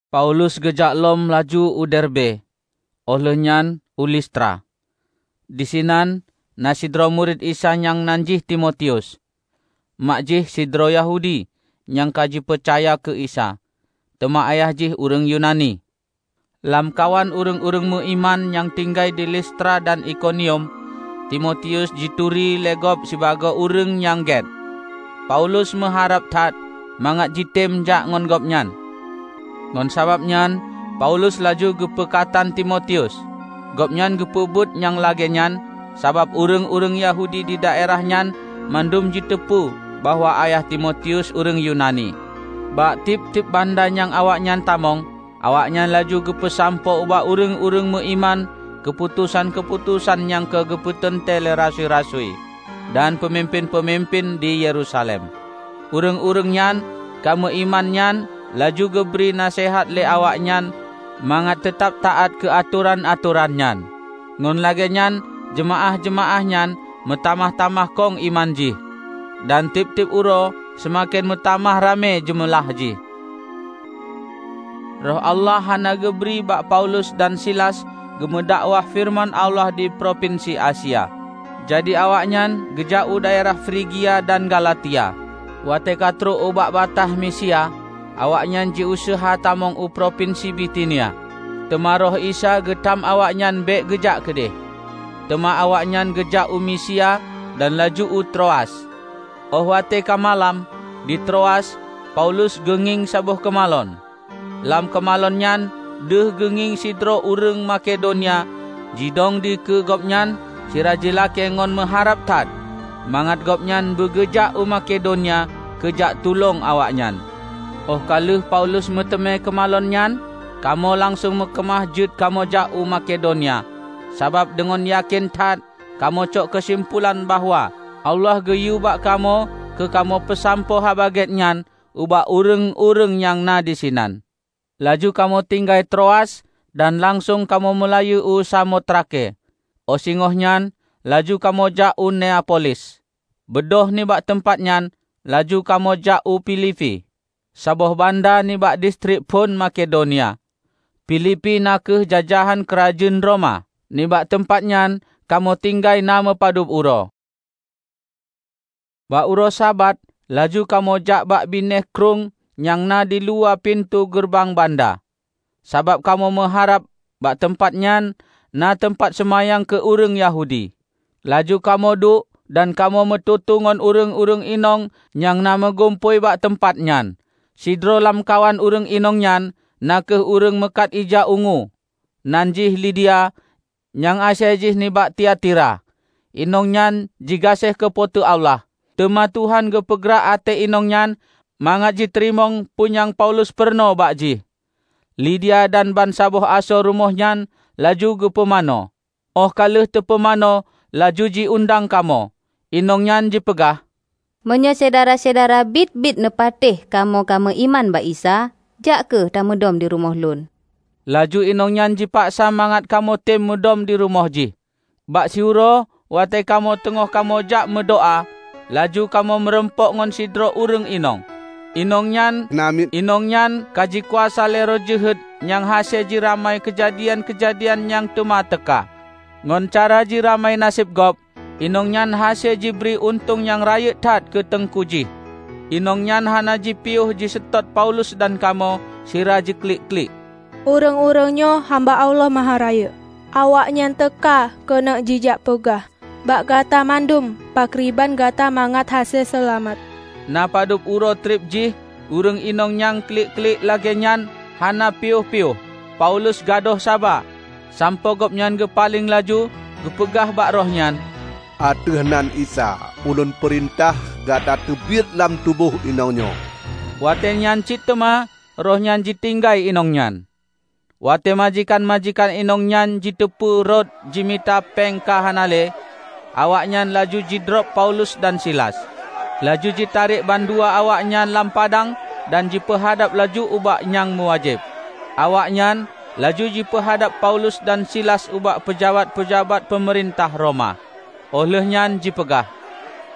Paulus geujak lom laju u Derbe, óh lheueh nyan u Listra. Disinan na sidroe murit Isa nyang nan jih Timotius. Mak jih sidroe Yahudi, nyang ka jipeucaya keu Isa; teuma ayah jih ureuëng Yunani. Lamkawan ureuëng-ureuëng meuiman nyang tinggai di Listra dan Ikonium, Timotius jituri lé gob sibagoe ureuëng nyang gét. Paulus meuharab that mangat jitem jak ngon gobnyan; ngon sabab nyan Paulus laju geupeukatan Timotius. Gobnyan geupeubuet nyang lagée nyan, sabab ureuëng-ureuëng Yahudi didaerah nyan mandum jiteupeu bahwa ayah Timotius ureuëng Yunani. Bak tieb-tieb banda nyang awaknyan tamong, awaknyan laju geupeusampoe ubak ureuëng-ureuëng meu iman keuputosan-keuputosan nyang ka geupeuteuntée lé rasui-rasui dan peumimpén-peumimpén di Yerusalem. Ureuëng-ureuëng nyang ka meu iman nyan laju geubri naseuhat lé awaknyan mangat teutab taát keu atoran-atoran nyan. Ngon lagée nyan jeumaáh-jeumaáh nyan meutamah-tamah kong iman jih, dan tieb-tieb uroe seumaken meutamah ramé jeumeulah jih. Roh Allah hana geubri bak Paulus dan Silas geumeudakwah feureuman Allah di propinsi Asia. Jadi awaknyan geujak u daerah Frigia dan Galatia. Watée ka trok ubak bataih Misia, awaknyan jiuseuha tamong u propinsi Bitinia, teuma Roh Isa geutam awaknyan bék geujak keudeh. Teuma awaknyan geujak u Misia dan laju u Troas. Óh watée ka malam, di Troas, Paulus geungieng saboh keumalon. Lam keumalon nyan deuh geungieng sidroe ureuëng Makedonia jidong dikeue gobnyan sira jilakée ngon meuharab that mangat gobnyan beugeujak u Makedonia keu jak tulông awaknyan. Óh ka lheueh Paulus meuteumé keumalon nyan, kamoe langsong meukeumah jeuet kamoe jak u Makedonia. Sabab, deungon yakén that kamoe cok keusimpulan bahwa Allah geuyue bak kamoe keu kamoe peusampoe Haba Gét nyan ubak ureuëng-ureuëng nyang na disinan. Laju kamoe tinggai Troas dan langsong kamoe meulayeue u Samotrake, óh singoh nyan laju kamoe jak u Neapolis. Beudôh nibak teumpat nyan laju kamoe jak u Filipi, saboh banda nibak distrik phon Makedonia. Filipi na kheueh jajahan keurajeuen Roma. Nibak teumpat nyan kamoe tinggai na meupadub uroe. Bak uroe Sabat laju kamoe jak bak binéh krueng nyang na diluwa pintoe geureubang banda, sabab kamoe meuharab bak teumpat nyan na teumpat seumayang keu ureuëng Yahudi. Laju kamoe duek dan kamoe meututoe ngon ureuëng-ureuëng inong nyang na meugumpôi bak teumpat nyan. Sidroe lamkawan ureuëng inong nyan na kheueh ureuëng meukat ija ungu, nan jih Lidia nyang asai jih nibak Tiatira. Inong nyan jigaséh keu Po teu Allah, teuma Tuhan geupeugrak até inong nyan mangat jiteurimong peue nyang Paulus peurunoe bak jih. Lidia dan bansaboh asoe rumoh nyan laju geupumanö. Óh ka lheueh teupumanö laju jiundang kamoe. Inong nyan jipeugah, "Meunyoe syedara-syedara biet-biet neupatéh kamoe ka meu iman bak Isa, jak kheueh tamudom dirumoh lôn." Laju inong nyan jipaksa mangat kamoetem mudom dirumoh jih. Bak siuroe watée kamoe teungoh kamoe jak meudoá, laju kamoe meurumpok ngon sidroe ureuëng inong; inong nyan namiet. Inong nyan ka jikuasa lé roh jeuhet nyang hase jiramai keujadian-keujadian nyang teuma teuka. Ngon cara jiramai naseb gob, inong nyan hase jibri untông nyang rayeuk that keu teungku jih. Inong nyan hana jipiôh jiseutôt Paulus dan kamoe sira jiklik-klik, "Ureuëng-ureuëng nyoe hamba Allah Maharayeuk! Awaknyan teuka keuneuk jijak peugah bak gata mandum pakriban gata mangat hase seulamat!" Na padub uroe treb jih ureuëng inong nyang jiklik-klik lagée nyan hana piôh-piôh. Paulus gadôh saba, sampoe gobnyan geupaleng laju geupeugah bak roh nyan, "Ateueh nan Isa ulôn peurintah gata teubiet lam tuboh inong nyoe!" Watée nyan cit teuma roh nyan jitinggai inong nyan. Watée majikan-majikan inong nyan jiteupeue rot jimita péng ka hana le, awaknyan laju jidrob Paulus dan Silas, laju jitarek bandua awaknyan lam padang dan jipeuhadab laju ubak nyang meuwajéb. Awaknyan laju jipeuhadab Paulus dan Silas ubak peujabat-peujabat peumeurintah Roma. Óh lheueh nyan jipeugah,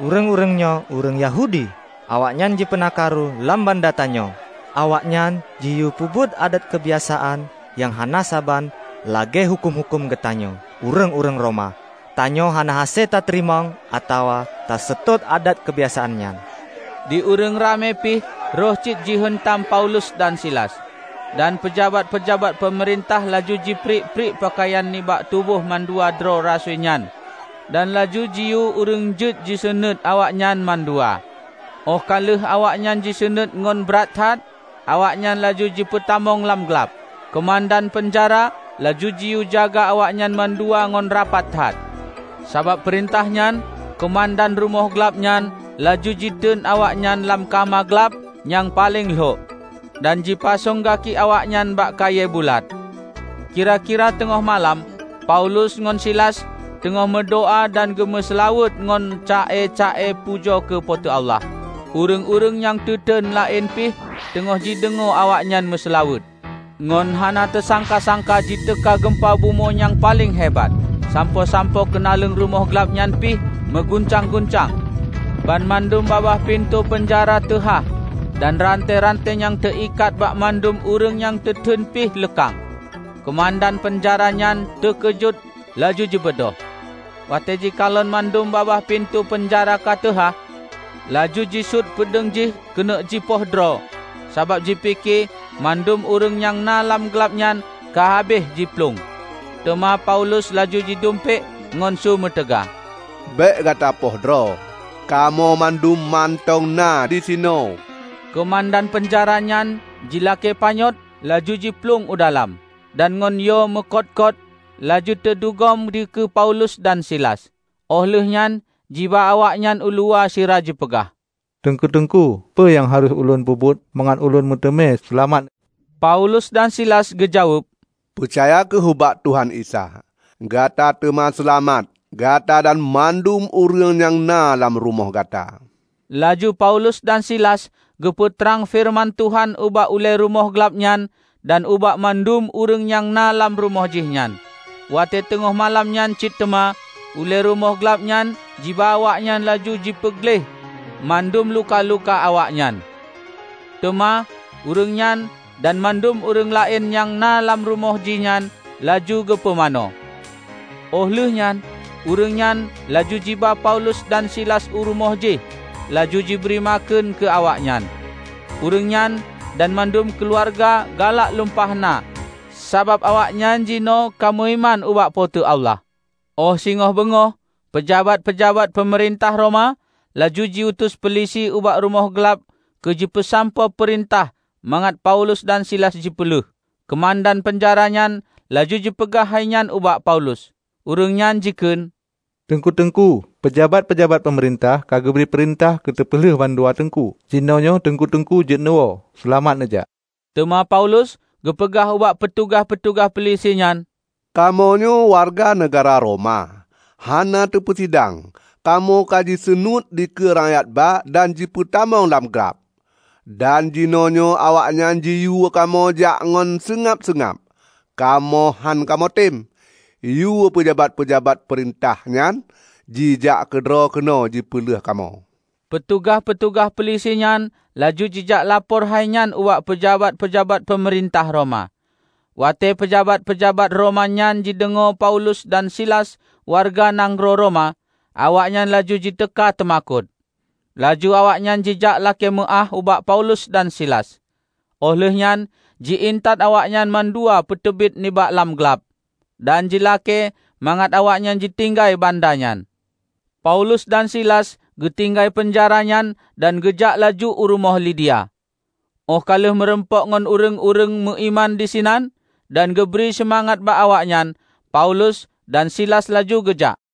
"Ureuëng-ureuëng nyoe ureuëng Yahudi. Awaknyan jipeuna karu lam banda tanyoe. Awaknyan jiyue peubuet adat keubiasaan nyang hana saban lagée huköm-huköm geutanyoe, ureuëng-ureuëng Roma. Tanyoe hana hase tateurimong atawa taseutôt adat keubiasaan nyan!" Di ureuëng ramé pih rhoh cit jiheuntam Paulus dan Silas; dan peujabat-peujabat peumeurintah laju jipriek-priek peukayan nibak tuboh mandua droe rasui nyan dan laju jiyue ureuëng jeuet jisunuet awaknyan mandua. Óh ka lheueh awaknyan jisunuet ngon brat that, awaknyan laju jipeutamong lam glab. Keumandan peunjara laju jiyue jaga awaknyan mandua ngon rapat that. Sabab peurintah nyan, keumandan rumoh glab nyan laju jiteun awaknyan lam kama glab nyang paleng lhok, dan jipasong gaki awaknyan bak kayée bulat. Kira-kira teungoh malam Paulus ngon Silas teungoh meudoá dan geumeuseulaweuet ngon ca-e-ca-e pujoe keu Po teu Allah. Ureuëng-ureuëng nyang teuten laén pih teungoh jideungoe awaknyoe meuseulaweuet. Ngon hana teusangka-sangka jiteuka geumpa bumoe nyang paleng hebat, sampoe-sampoe keunaleueng rumoh glab nyan pih meuguncang-guncang. Banmandum babah pintoe peunjara teuhah dan rante-rante nyang teuikat bak mandum ureuëng nyang teuteuen pih leukang. Keumandan peunjara nyan teukeujot laju jibeudôh. Watée jikalon mandum babah pintoe peunjara ka teuhah, laju jisuet peudeueng jih keuneuk jipoh droe sabab jipike mandum ureuëng nyang na lam glab nyan ka habéh jiplueng. Teuma Paulus laju jidumpék ngon su meutaga, "Bék gata poh droe! Kamoe mandum mantong na disinoe!" Keumandan peunjara nyan jilakée panyöt laju jiplueng u dalam, dan ngon yo meukot-kot laju teudugom dikeue Paulus dan Silas. Óh lheueh nyan jiba awaknyan uluwa sira jipeugah, "Teungku-teungku, peue nyang harôh ulôn peubuet mangat ulôn meuteumé seulamat?" Paulus dan Silas geujaweueb, "Peucaya kheueh ubak Tuhan Isa! Gata teuma seulamat -- gata dan mandum ureuëng nyang na lam rumoh gata!" Laju Paulus dan Silas geupeu trang feureuman Tuhan ubak ulée rumoh glab nyan dan ubak mandum ureuëng nyang na lam rumoh jihnyan. Watée teungoh malam nyan cit teuma, ulée rumoh glab nyan jiba awaknyan laju jipeugleh mandum luka-luka awaknyan. Teuma ureuëng nyan dan mandum ureuëng laén nyang na lam rumoh jih nyan laju geupumanö. Óh lheueh nyan ureuëng nyan laju jiba Paulus dan Silas u rumoh jih laju jibri makheun keu awaknyan. Ureuëng nyan dan mandum keuluwarga galak lumpah na sabab awaknyan jinoe ka meuiman ubak Po teu Allah. Óh singoh beungoh, peujabat-peujabat peumeurintah Roma laju jiutus peulisi ubak rumoh glab keu jipeusampoe peurintah mangat Paulus dan Silas jipeuleueh. Keumandan peunjara nyan laju jipeugah hainyan ubak Paulus. Ureuëng nyan jikheun, "Teungku-teungku, peujabat-peujabat peumeurintah ka geubri peurintah keu teupeuleueh mandua teungku, jinyoe teungku-teungku jeuet neuwoe. Seulamat neujak!" Teuma Paulus geupeugah ubak peutugaih-peutugaih peulisi nyan, "Kamoe nyoe wareuga nanggroe Roma. Hana teupeusidang, kamoe ka jiseunuét dikeue rakyat ba dan jipeutamong lam glab. Dan jinoenyoe awaknyan jiyue kamoe jak ngon seungab-seungab? Kamoe hán kamoe tem! Yue peujabat-peujabat peumeurintah nyan jijak keudroe keunoe jipeuleueh kamoe." Peutugaih-peutugaih peulisinyan laju jijak lapor hainyan ubak peujabat-peujabat peumeurintah Roma. Watée peujabat-peujabat Roma nyan jideungoe Paulus dan Silas wareuga nanggroe Roma, awaknyan laju jiteuka teumakot. Laju awaknyan jijak lakée meuáh ubak Paulus dan Silas, óh lheueh nyan ji-intat awaknyan mandua peuteubiet nibak lam glab, dan jilakée mangat awaknyan jitinggai banda nyan. Paulus dan Silas geutinggai peunjara nyan dan geujak laju u rumoh Lidia. Óh ka lheueh meurumpok ngon ureuëng-ureuëng meu iman disinan, dan geubri seumangat bak awaknyan, Paulus dan Silas laju geujak.